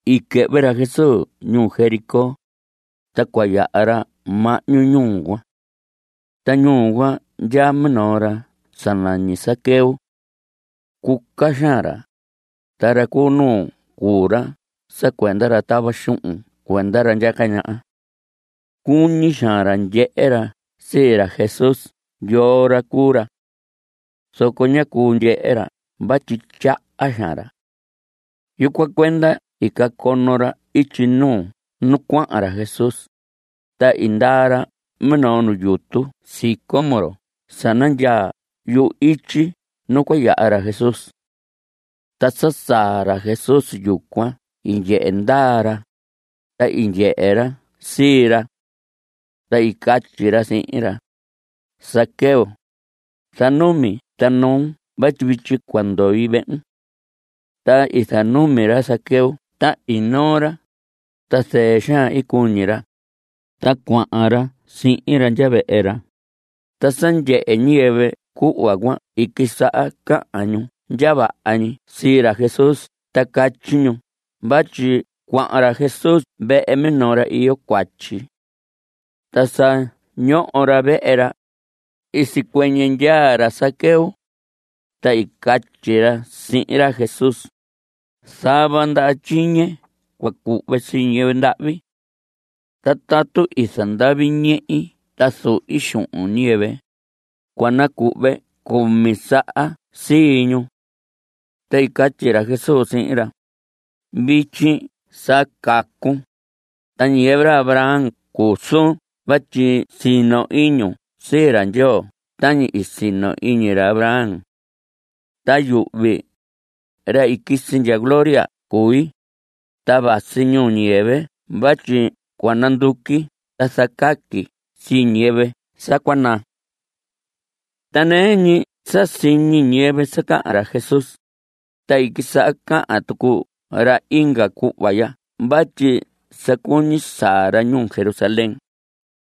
I quɨhvɨ ra Jesús ñuu Jericó, ta cua yaha ra mahñu ñuu cuan. Ta ñuu cuan ndyaa minoo ra sa nañi Zaqueo. Cuca xaan ra. Ta ra cu nuu cuu ra sa cuenda ra tava xuhun cuenda ra ndyaca ñaha. Cuñi xaan ra ndyehe ra sii ra Jesús yoo ra cuu ra. Zoco ñá cuu ndyehe ra vatyi tyaha xaan ra. Yucuan cuenda i cacono ra ityi nuu nu cuahan ra Jesús, ta i ndaa ra minoo nu yutu sicómoro sa nandyaa yu‑ityi nu cua yaha ra Jesús. Ta sa saa ra Jesús yucuan i ndyehe ndaa ra, ta i ndyehe ra sii ra. Ta i catyi ra sihin ra: Zaqueo, zanumi ta noon vatyi vityi cua ndoi vehun. Ta i zanumi ra Zaqueo ta i noo ra. Ta zɨɨ xaan i cuñi ra, ta cuahan ra sihin ra ndya vehe ra. Ta sa ndyehe ñiyɨvɨ cuhva cuan i quisaha cahan ñu ndya vaha ñi sii ra Jesús ta catyi ñu vatyi cuahan ra Jesús vehe minoo ra iyo cuatyi. Ta sa ñoho ra vehe ra, i sicuɨñɨ ndyaa ra Zaqueo, ta i catyi ra sihin ra Jesús: Zava ndaha tyiñe cua cuhve sii ñiyɨvɨ ndahvi. Ta tatu i zandavi ñehi ta zuhi xuhun ñiyɨvɨ, cua nacuhve cumi saha sii ñu. Ta i catyi ra Jesús sihin ra: Vityi sa cacun, ta ñiyɨvɨ ra Abraham cuu suun vatyi sino iñun sii ra Ndyoo tañi i sino iñi ra Abraham. Ta yuhvi, ra i quisi ndya gloria cui, ta vasi ñuu ñiyɨvɨ vatyi cua nanduqui ta zacaqui sii ñiyɨvɨ sa cua naa. Ta nɨɨ ñi sa siñi ñiyɨvɨ sa cahan ra Jesús, ta i quisaha cahan tucu ra inga cuhva ya vatyi sa cuñi saa ra ñuu Jerusalén,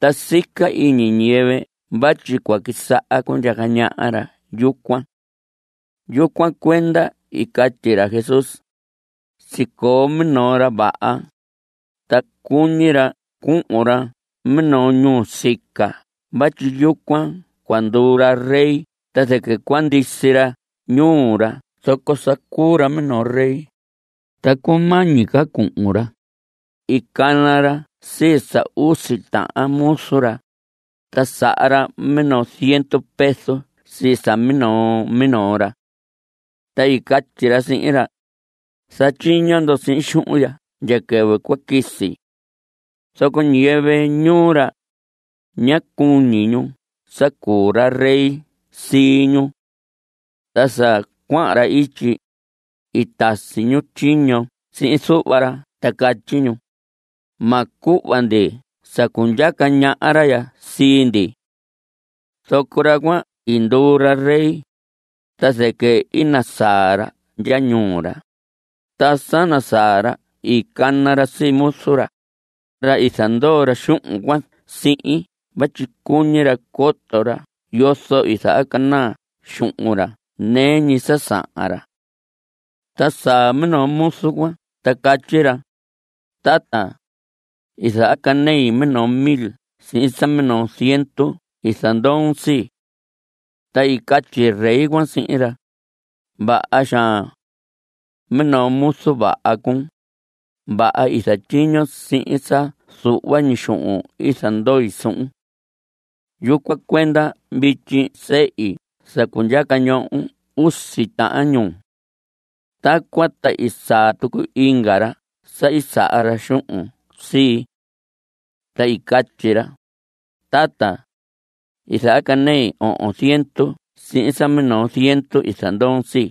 ta sica iñi ñiyɨvɨ vatyi cua quisaha cundyaca ñaha ra yucuan. Yucuan cuenda i catyi ra Jesús: Sicoo minoo ra vaha, ta cuñi ra cuhun ra minoo ñuu nusica vatyi yucuan cua nduu ra rey ta zɨquɨ cua ndisi ra ñuu ra zoco sa cuu ra minoo rey. Ta cumañi ca cuhun ra, i cana ra sii sa usi tahan muzu ra, ta saha ra minoo ziendu peso sii sa minoo minoo ra. Ta i catyi ra sihin ra: “Zatyiño ndo sihin xuhun ya ndya quɨvɨ cua quisi.” Zoco ñiyɨvɨ ñuu ra, ñá cuñi ñu sa cuu ra rey sii ñu. Ta sa cuahan ra ityi, i tasi ñu tyiño sihin zuhva ra ta catyi ñu: “Ma cuhva ndi sa cundyaca ñaha ra ya sii ndi.” Zoco ra cuan i nduu ra rey, ta zɨquɨ i nasaa ra ndya ñuu ra. Ta sa nasaa ra i cana ra sii muzu ra, ra i zandoo ra xuhun cuan sihin vatyi cuñi ra coto ra yozo i zahacanaa xuhun ra nɨɨ ñi sa sahan ra. Ta saa minoo muzu cuan ta catyi ra: “Tata, i zahacanei minoo mil sihin sa minoo ziendu i zandoon sii.” Ta i catyi rey cuan sihin ra: “Vaha xaan. Minoo muzu vaha cuun. Vaha i zatyiñon sihin sa zuhva ñi xuhun i zandoi suhun. Yucuan cuenda vityi sehi sa cundyaca ñohon usi tahan ñuu.” Tacuan ta i saa tucu inga ra sa i saha ra xuhun sii. Ta i catyi ra: “Tata, i zahacanei ohon ziendu sihin sa minoo ziendu i zandoon sii.”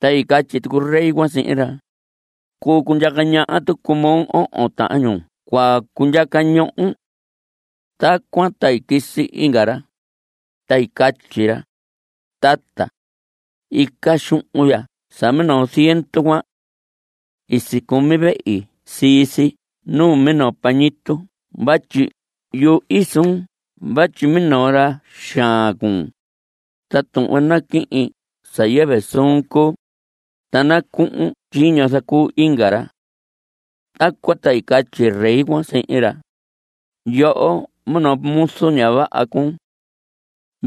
Ta i catyi tucu rey cuan sihin ra: “Cuu cundyaca ñaha tucu moo; ohon tahan ñuu cua cundyaca ñohon.” Tacuan ta i quisi inga ra, ta i catyi ra: “Tata, ica xuhun ya sa minoo ziendu cuan. I sicumi vehi sii si nuu minoo pañitu vatyi yuhi suun vatyi minoo ra xaan cuun, ta tuhvon naquihin sa yɨvɨ suun cuu, ta nacuhun tyiño zacuu inga ra.” Tacuan ta i catyi rey cuan sihin ra: “Yoho minoo muzu ña vaha cuun.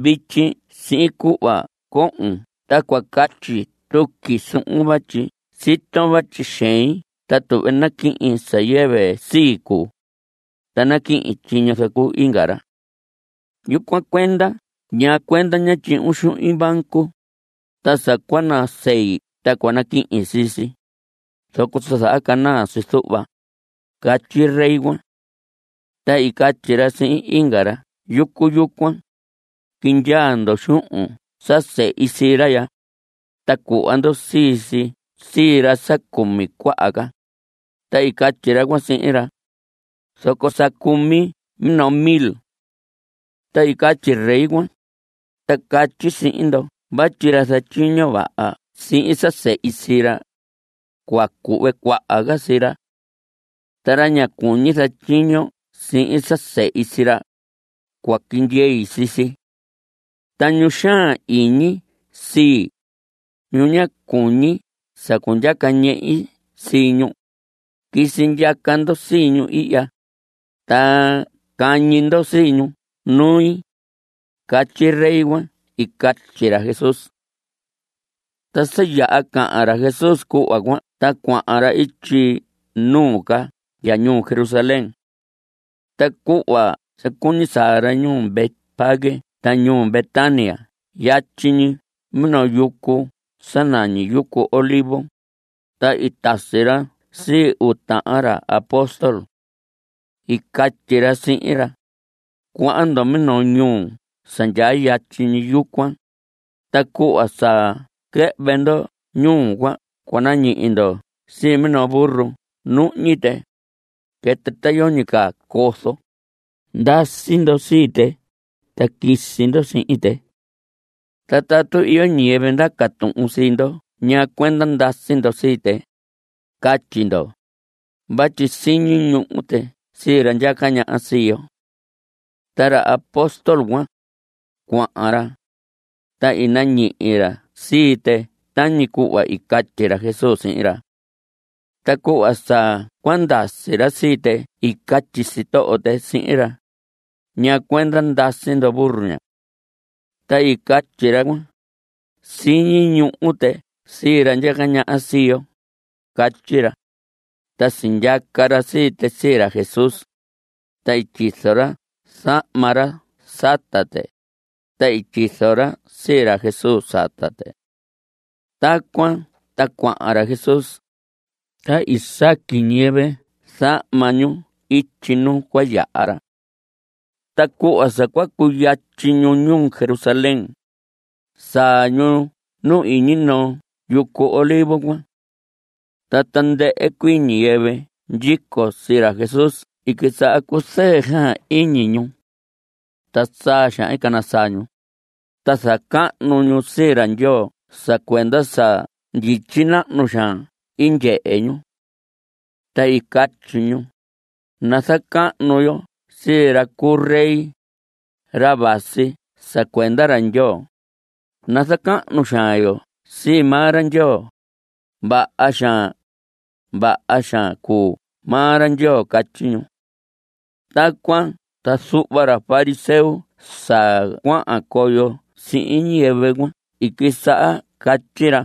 Vityi sihin cuhva cohon ta cua catyi tuqui suhun vatyi siton vatyi xein ta tuhve naquihin sa yɨvɨ sii cuu, ta naquihin tyiño zacuu inga ra. Yucuan cuenda ¿ñaa cuenda ñá tyuhun xuhin banco, ta sa cua nasei ta cua naquihin sii si, zoco sa zahacanaa si zuhva?” Catyi rey cuan. Ta i catyi ra sihin inga ra yucu yucuan: “Quindyaa ndo xuhun sa sehi sii ra ya, ta cuhva ndo sii si sii ra sa cumi cuaha ca.” Ta i catyi ra cuan sihin ra: “Zoco sa cumi minoo mil.” Ta i catyi rey cuan: “Ta catyi sihin ndo vatyi ra zatyiño vaha sihin sa sehi sii ra, cua cuhve cuaha ca sii ra. Ta ra ña cuñi zatyiño sihin sa sehi sii ra, cua quindyei sii si. Ta ñu xaan iñi sii, ñu ña cuñi sa cundyaca ñehi sii ñu, quisi ndyaca ndo sii ñu ihya, ta cahñi ndo sii ñu nui.” Catyi rey cuan i catyi ra Jesús. Ta sa yaha cahan ra Jesús cuhva cuan ta cuahan ra ityi nuu ca ndya ñuu Jerusalén. Ta cuhva sa cuñi saa ra ñuu Betfagé ta ñuu Betania yatyi ñi minoo yucu sa nañi yucu Olivos, ta i tasi ra sii uu tahan ra apóstol. I catyi ra sihin ra: Cuahan ndo minoo ñuu sa ndyaa yatyi ñi yucuan, ta cuhva sa quɨhvɨ ndo ñuu cuan cua nañihi ndo sii minoo burro nuhñi tɨ. Quɨtɨ ta yoñi ca cozo. Ndasi ndo sii tɨ, ta quisi ndo sihin tɨ. Ta tatu iyo ñiyɨvɨ ndaca tuhun sii ndo ñaa cuenda ndasi ndo sii tɨ, catyi ndo: “Vatyi siñi ñuhu tɨ sii ra ndyaca ñaha sii yo.” Ta ra apóstol cuan, cuahan ra, ta i nañihi ra sii tɨ tañi cuhva i catyi ra Jesús sihin ra. Ta cuhva sa cua ndasi ra sii tɨ i catyi sitoho tɨ sihin ra: ¿Ñaa cuenda ndasi ndo burro ña? Ta i catyi ra cuan: Siñi ñuhu tɨ sii ra ndyaca ñaha sii yo. Catyi ra. Ta sindyaca ra sii tɨ sii ra Jesús. Ta i tyizo ra zahma ra sata tɨ, ta i tyizo ra sii ra Jesús sata tɨ. Tacuan ta cuahan ra Jesús. Ta i saqui ñiyɨvɨ zahma ñu ityi nu cua yaha ra. Ta cuhva sa cua cuyatyi ñu ñuu Jerusalén, saa ñu nu iñi noo yucu Olivos cuan. Ta tandɨhɨ cuii ñiyɨvɨ ndyico sii ra Jesús i quisaha cuzɨɨ xaan iñi ñu. Ta saa xaan cana saa ñu, ta zacahnu ñu sii ra Ndyoo sa cuenda sa ndyityi nahnu xaan i ndyehe ñu. Ta i catyi ñu: ¡Nazacahnu yo sii ra cuu rey, ra vasi sa cuenda ra Ndyoo! ¡Nazacahnu xaan yo sii maa ra Ndyoo! ¡Vaha xaan, vaha xaan cuu maa ra Ndyoo! Catyi ñu. Tacuan ta zuhva ra fariseo sa cuahan coyo sihin ñiyɨvɨ cuan i quisaha catyi ra: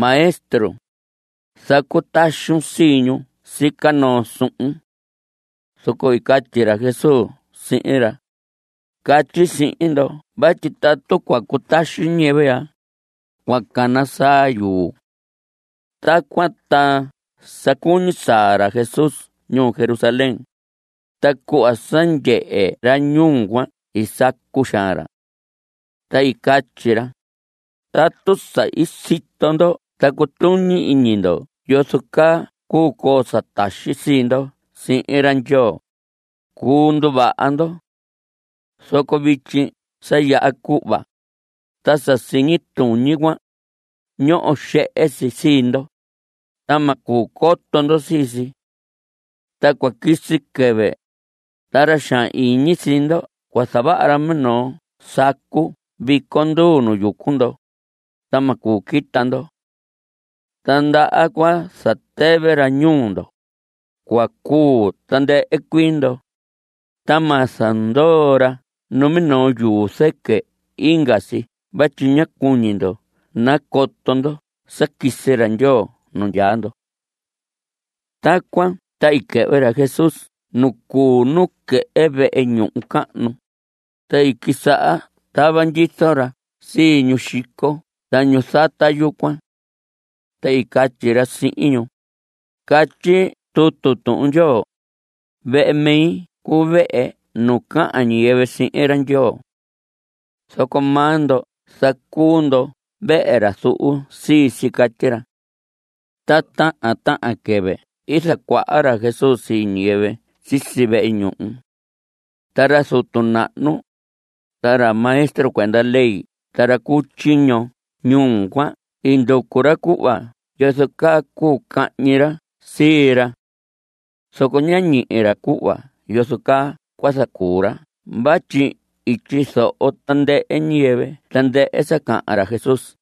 Maestro, zacutaxun sii ñu sica noo suhun. Zoco i catyi ra Jesús sihin ra: Catyi sihin ndo vatyi tatu cua cutaxi ñiyɨvɨ ya, cua cana saa yuu. Tacuan ta sa cuñi saa ra Jesús ñuu Jerusalén, ta cuhva sa ndyehe ra ñuu cuan i sacu xaan ra. Ta i catyi ra: Tatu sa i sito ndo ta cutuñi iñi ndo yozo caa cuu coo sa taxi sii ndo sihin ra Ndyoo, cuu nduvaha ndo. Zoco vityi sa yaha cuhva. Ta sa siñi tuñi cuan, ñoho xehe si sii ndo, ta ma cuu coto ndo sii si. Ta cua quisi quɨvɨ, ta ra xaan iñi sii ndo cua zavaha ra minoo sacu viconduu nu yucu ndo, ta ma cuu quita ndo. Ta ndaha cua zatɨvɨ ra ñuu ndo. Cua cuu tandɨhɨ cuii ndo. Ta ma zandoo ra numinoo yuu zɨquɨ inga si vatyi ña cuñi ndo nacoto ndo sa quisi ra Ndyoo nu ndyaa ndo. Tacuan ta i quɨhvɨ ra Jesús nu cuu nuquehe vehe ñuhu cahnu, ta i quisaha tava ndyizo ra sii ñu xico ta ñu zata yucuan. Ta i catyi ra sihin ñu: Catyi tutu Tuhun Ndyoo: “Vehe mi cuu vehe nu cahan ñiyɨvɨ sihin ra Ndyoo.” Zoco maa ndo zacuu ndo vehe ra zuhu sii si. Catyi ra. Ta tahan tahan quɨvɨ i zacuaha ra Jesús sii ñiyɨvɨ sisi vehe ñuhu. Ta ra zutu nahnu, ta ra maestro cuenda ley ta ra cu tyiño ñuu cuan i nducu ra cuhva yozo caa cuu cahñi ra sii ra. Zoco ñá ñihi ra cuhva yozo caa cua zacuu ra vatyi i tyizoho tandɨhɨ ñiyɨvɨ tandɨhɨ sa cahan ra Jesús.